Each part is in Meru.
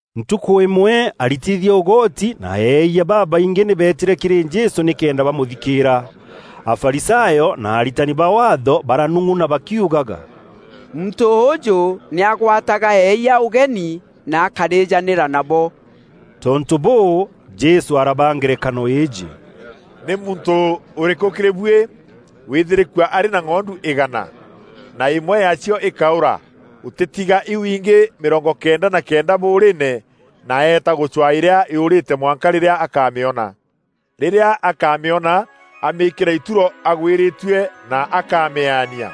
Ntukû îmwe aritithia ûgoti na eeyia babaingî nî beetîre kîrî Jesû nîkenda bamûthikîîra. Afarisayo na aritani ba Waatho baranung'una bakiugaga, “Muntû ûûjû nî agwataga eeyia ûgeni na akarîjanîra nabo.” Tontû bûû, Jesû arabaa ngerekano îîjî: “Nî muntû ûrîkû kîrî buî wîthîrîkua arî na ng'ondu îgana, na îmwe yaacio îkaûra, ûtîtiga iu ingî mîrongo kenda na kenda bûûrîîne, na eeta gûcwaa îrîa yûûrîte mwanka rîrîa akaamîona? Rîrîa akamîona amîîkîra ituro agwîrîtue, na akamîaania.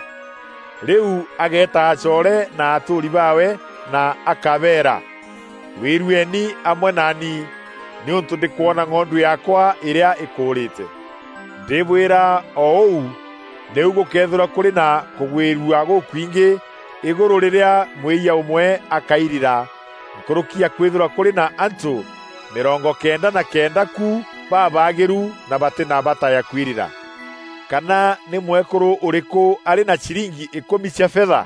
Rîu ageeta acoore na atûûri baawe na akabeera, ‘Gwîrueni amwe naani, nîûntû ndîkwona ng'ondu yaakwa îrîa îkûûrîte.’ Ndîbwîra, o ûu nîu gûkeethîrwa kûrî na kûgwîrua gûkwingî îgûrû rîrîa mwîyia ûmwe akairira, nkûrûki ya kwîthîrwa kûrî na antû mîrongo kenda na kenda ku babaagîru na batî na bata ya kwirira. “Kana nî mwekûrû ûrîkû arî na ciringi îkûmi cia fetha,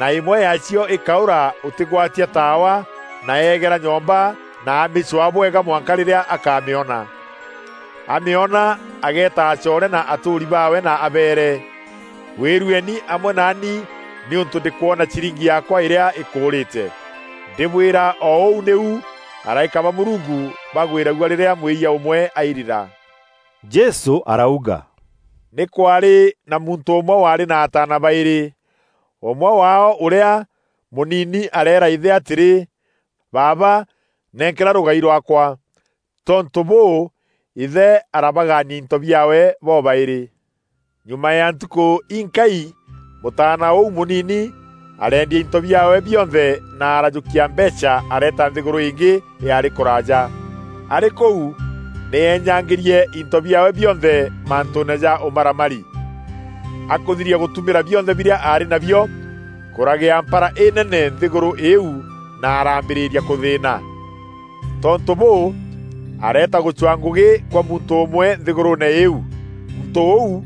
na îmwe yaacio îkaûra ûtîgwatia taawa na eegera nyomba na amîcwaa bwega mwanka rîrîa akaamîona? Amîona, ageeta acoore na atûûri baawe na abeere, ‘Gwîrueni amwe naani nîûntû ndîkwona ciringi yaakwa îrîa îkûûrîte.’ Ndîbwîra, o ûu nîu araîka ba Mûrungu bagwîragua rîrîa mwîyia ûmwe airira.” Jesû arauga, “Nî kwaarî na muntû ûmwe waarî na ataana baîrî. Ûmwe waao ûrîa, mûnini areera îthe atîrî, ‘Baaba, nenkera rûgai rwaakwa.’ Tontû bûû, îthe arabagaania into biaawe bobaîrî. Nyuma ya ntukû inkai mûtaana ûu mûnini, arendia into biaawe bionthe na arajûkia mbeecha areeta nthîgûrû îngî yaarî kûraaja. Arî kûu, nî eenyangîrie into biaawe bionthe mantûûne ja ûmaramari. Akûthiria gûtûmîra bionthe birîa aarî nabio, kûragia mpara înene nthîgûrû îîu na araambîrîria kûthîîna. Tontû bûû, areeta gûcwaa ngûgî kwa muntû ûmwe nthîgûrûûne îîu. Muntû ûu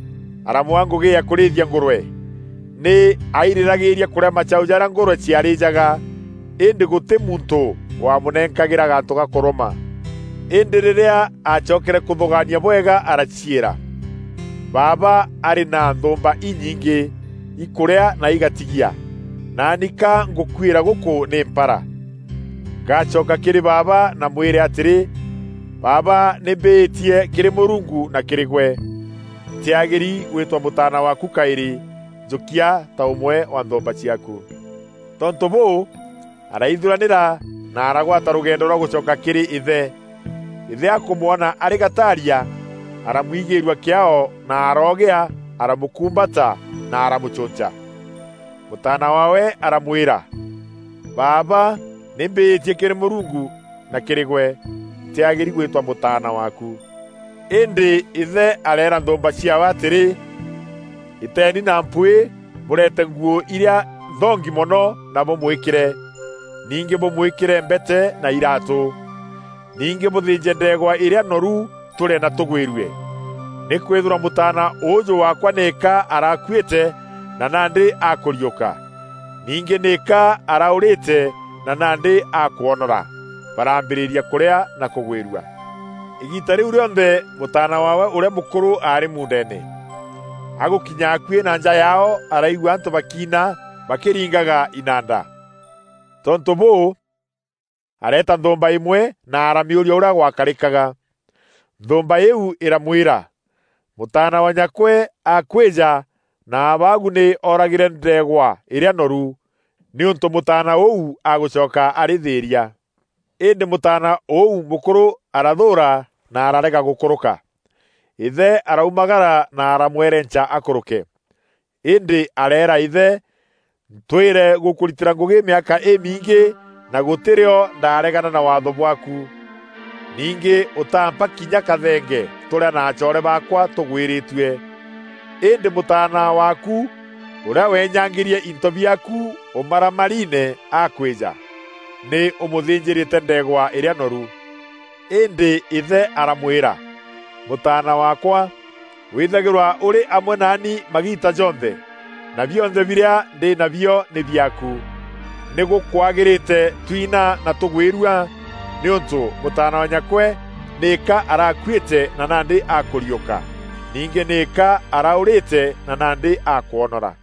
aramwaa ngûgî ya kûrîthia ngûrwe. Nî airîragîîria kûrîa macaû jarîa ngûrwe ciarîjaga, îndî gûtî muntû wamûnenkagîra gantû ga kûrûma. Îndî rîrîa acokere kûthûgaania bwega araciîra, ‘Baaba arî na nthûûmba inyingî, ikûrîa na igatigia, naani ka ngûkuîra gûkû nî mpara! Ngacoka kîrî baaba na mwîre atîrî, “Baaba, nî mbîîtie kîrî Mûrungu na kîrî gwe. Ntîagîri gwîtwa mûtaana waaku kaîrî; njûkia ta ûmwe wa nthûûmba ciaaku.”’ Tontû bûû, araithuranîra na aragwata rûgendo rwa gûcoka kîrî îthe. Îthe akûmwona arî gataaria, aramwigîîrua kîaao na aroogîa aramûkûmbata, na aramûcûnca. Mûtaana waawe aramwîra, ‘Baaba, nî mbîîtie kîrî Mûrungu na kîrî gwe. Ntîagîri gwîtwa mûtaana waaku.’ Îndî îthe areera nthûûmba ciaawe atîrî, ‘Îteeni na mpwîî bûreete nguû irîa nthongi mono na bûmwîkîre. Ningî bûmwîkîre mbete na iraatû. Ningî bûthînje ndeegwa îrîa noru, tûrîe na tûgwîrue. Nîkwîthîrwa mûtaana ûûjû waakwa nîka arakuîte, na nandî akûriûka. Ningî nîka araûrîte na nandî akwonora.’ Baraambîrîria kûrîa na kûgwîrua. “Îgiita rîu rîonthe mûtaana waawe ûrîa mûkûrû aarî muundeene. Agûkinya akuî na nja yaao araigua antû bakiina bakîringaga inanda. Tontû bûû, areeta nthûûmba îmwe na aramîûria ûrîa gwakarîkaga. Nthûûmba îîu îramwîra, ‘Mûtaana wa nyakwe akwîja na abaagu nî oragîre ndeegwa îrîa noru, nîûntû mûtaana ûu agûcoka arî thîîria.’ Îndî mûtaana ûu mûkûrû arathûûra na ararega gûkûrûka. Îthe araumagara na aramwerenca akûrûke. Îndî areera îthe, ‘Ntwîre gûkûritîra ngûgî mîaka îmingî na gûtî rîo ndaregana na waatho bwaaku. Ningî ûtaampa kinya kathenge tûrîa na acoore baakwa tûgwîrîtue. Îndî mûtaana waaku, ûrîa weenyangîrie into biaaku ûmaramariine akwîja, nî ûmûthînjîîre ndeegwa îrîa noru!’ Îndî îthe aramwîra, ‘Mûtaana waakwa, wîthagîrwa ûrî amwe naani magiita jonthe, na bionthe birîa ndî nabio nî biaaku. Nî gûkwagîrîte twina na tûgwîrua, nîûntû mûtaana wa nyakwe nîka arakuîte na nandî akûriûka. Ningî nîka araûrîte na nandî akwonora.’”